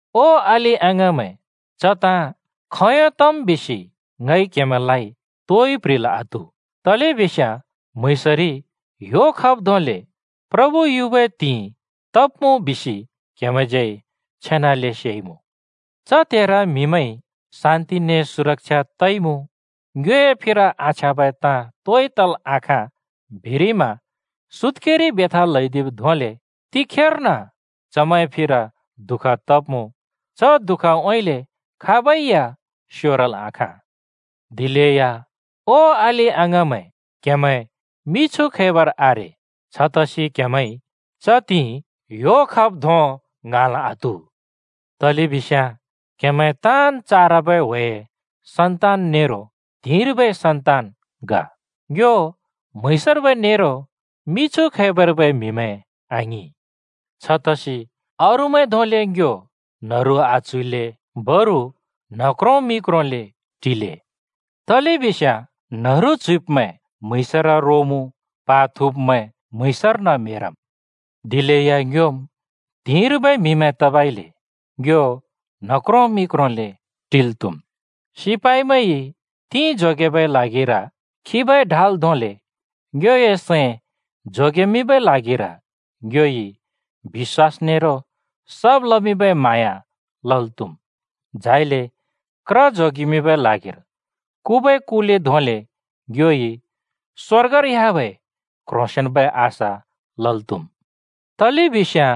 ओ अलि-अङाँमैं, च ताँ खोंयों तम् बिसि ङइ क्‍हेमैंलाइ तोइ प्‍ह्रिल् आत्‍हु, तलेबिस्याँ म्‍हुँइँसरि ह्‍यो खब् धोंले प्रभु युबै त्हिंइ तब्‍मुँ बिसि क्‍हेमैंज्यै छेनाले सेइमुँ। च त्हेर म्‍हिमैंइ “शान्‍ति ने सुरक्षा तइमुँ, ङ्योए फिर आछ्याँबै ताँ तोइ तल् आखाँ,” बिरिमा सुत्‍केरि बेथा ल्हैदिब् धोंले तिखेर्न चमैंए फिर दुःख तब्‍मुँ। च दुःखउँइँले खाबै या स्योरल् आखाँ। दिलेया ओ अलि-अङाँमैं, क्‍हेमैं मिछु खैबर आरे। छतसि क्हेमैंइ च त्हिंइ ह्‍यो खब् धों ङ्हाँल् आत्‍हु। तलेबिस्याँ क्‍हेमैं ताँन् चारबै ह्‍वेए सन्तान नेरो त्हिंर्बै सन्तान ग। ङ्यो म्‍हुँइँसर्बै नेरो मिछु खैबर्बै म्‍हिमैं आङिं। छतसि अरूमैं धोंले ङ्यो न्‍हरु आच्‍हुइल्‍ले बरु न्ह क्रों मि क्रोंले टिले। तलेबिस्याँ न्हरु च्‍हुइब्मैं म्‍हुँइँसर रोमुँ, प्हा थुँब्मैं म्हुँइँसर्न म्हेरम्। दिलेया ङ्योम् त्हिंर्बै म्‍हिमैं तबइले ङ्यो न्ह क्रों मि क्रोंले टिल् त्‍हुम्। सिपाइमैंइ तिं थोबए ल्हागिर खिबै ढाल धोंले ङ्योए सैं जोगेमिंबै ल्हागिर ङ्योइ बिश्‍वास नेरो सब् लमिंबै म्हाँया लल् त्‍हुम्, झाइले क्र जोगेबै ल्हागिर कुबै कुले धोंले ङ्योइ स्‍वर्गर ह्‍याबै क्ह्रोंसेंन्बै आशा लल् त्‍हुम्। तलेबिस्याँ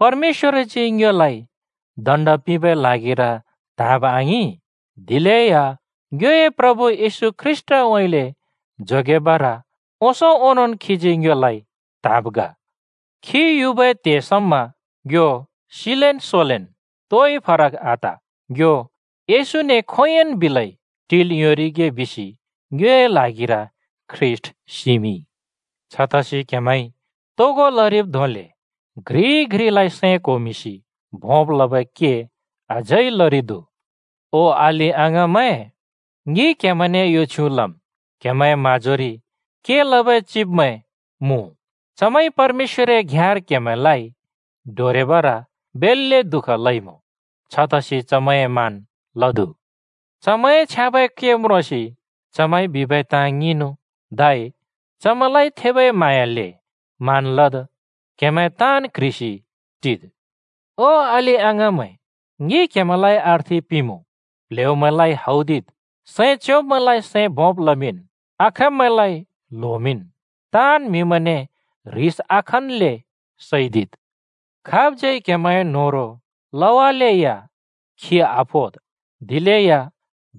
परमेश्‍वरजी ङ्योलाइ दण्ड पिंबै ल्हागिर त्‍हाँब आङिं, दिलेया ङ्योए प्रभु येशू ख्रीष्‍टउँइँले जोगेबर ओंसों ओंनोंन् खीजी ङ्योलाइ त्‍हाँब् ग। खी युबै त्हेर ङ्यो सिलेन् सोलेन् तोइ फरक आत, ङ्यो येशूने खोंयोंन् बिलै टिल् योंरिगे बिसि ङ्योए ल्हागिर ख्रीष्‍ट सिमिंइ। छतसि क्‍हेमैंइ तोगो लरिब् धोंले घ्रिइ घ्रिलाइ सैं क्होमिंसि भोंब् लबै के अझै लरिदु। ओ अलि-अङाँमैं, ङि क्‍हेमैंने यो छ्युँ लम्: क्‍हेमैंए म्‍हाँजोरि के लबै चिबमैं मुँ। चमैंइ परमेश्‍वरए घ्‍याँर क्हेमैंलाइ डोरेबर बेल्‍ले दुःख लइमुँ। छतसि चमैंए मान लद्। चमैंए छ्याँबै के म्रोंसि चमैंइ बिबै ताँ ङिंनु, धै चमैंलाइ थेबै म्हाँयाले मान लद्। क्‍हेमैं ताँन् क्ह्रिसि टिद्। ओ अलि-अङाँमैं, ङि क्हेमैंलाइ अर्थि पिंमुँ: प्ल्हेउमैंलाइ हौदिद, सैं च्योंब्मैंलाइ सैं भोंब लमिंन्, आखाँब्मैंलाइ ल्होमिंन्, ताँन् म्हिमैंने ह्रिस आखनले सैदिद्। खाबज्‍यै क्हेमैंए न्होह्रों लवालेया खि आफोद्, दिलेया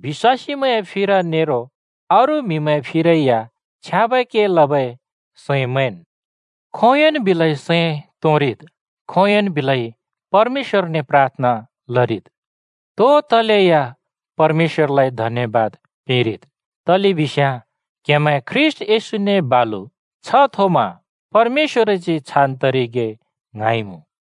बिश्‍वासीमैंए फिर नेरो अरू म्‍हिमैंए फिरै या छ्याँबै के लबै सैं मैंन्। खोंयोंन् बिलै सैं तोंरिद्। खोंयोंन् बिलै परमेश्‍वरने प्राथना लरिद्। तो तलेया परमेश्‍वरलाइ धन्‍यबाद पिंरिद्, तलेबिस्याँ क्‍हेमैं ख्रीष्‍ट येशूने बालु छ्ह थोमा परमेश्‍वरजी छान् तरिगे ङ्हाँइमुँ।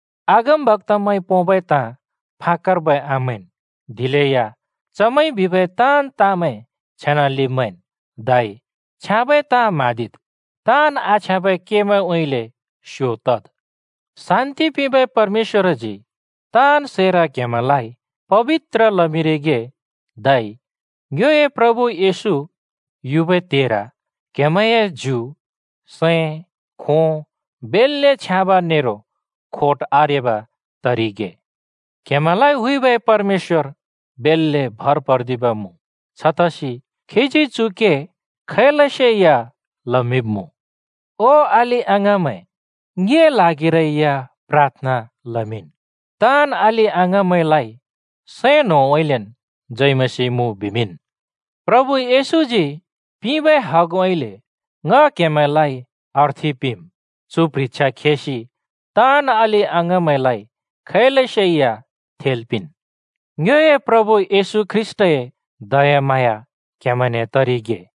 अगमबक्‍तामैंइ पोंबै ताँ फाकर्बै आमैंन्, दिलेया चमैंइ बिबै ताँन् ताँमैं छेनाले मैंन्, धै छ्याँबै ताँ म्हाँदिद्, ताँन् आछ्याँबै केमैंउँइँले स्यो तद्। शान्ति पिंबै परमेश्‍वरजी ताँन् सैर क्‍हेमैंलाइ पबित्र लमिंरिगे, धै ङ्योए प्रभु येशू युबै त्हेर क्हेमैंए ज्यु, सैं, खों, बेल्‍ले छ्याँब नेरो खोट आरेब तरिगे। क्हेमैंलाइ हुइबै परमेश्‍वर भर पर्दिब मुँ, छतसि खीजी चु के खैलसेया लमिंब्‍मुँ। ओ अलि-अङाँमैं, ङिए ल्हागिरै या प्राथना लमिंन्। ताँन् अलि-अङाँमैंलाइ सैं न्होंउँइँलेन् जय मसीह मुँ बिमिंन्। प्रभु येशूजी पिंबै हगउँइँले ङ क्हेमैंने अर्थि पिंम्: चु प्ह्रिछ्या खेसि ताँन् अलि-अङाँमैंलाइ खैलसे या थेल् पिंन्। ङ्योए प्रभु येशू ख्रीष्‍टए दयाम्हाँया क्‍हेमैंने तरिगे।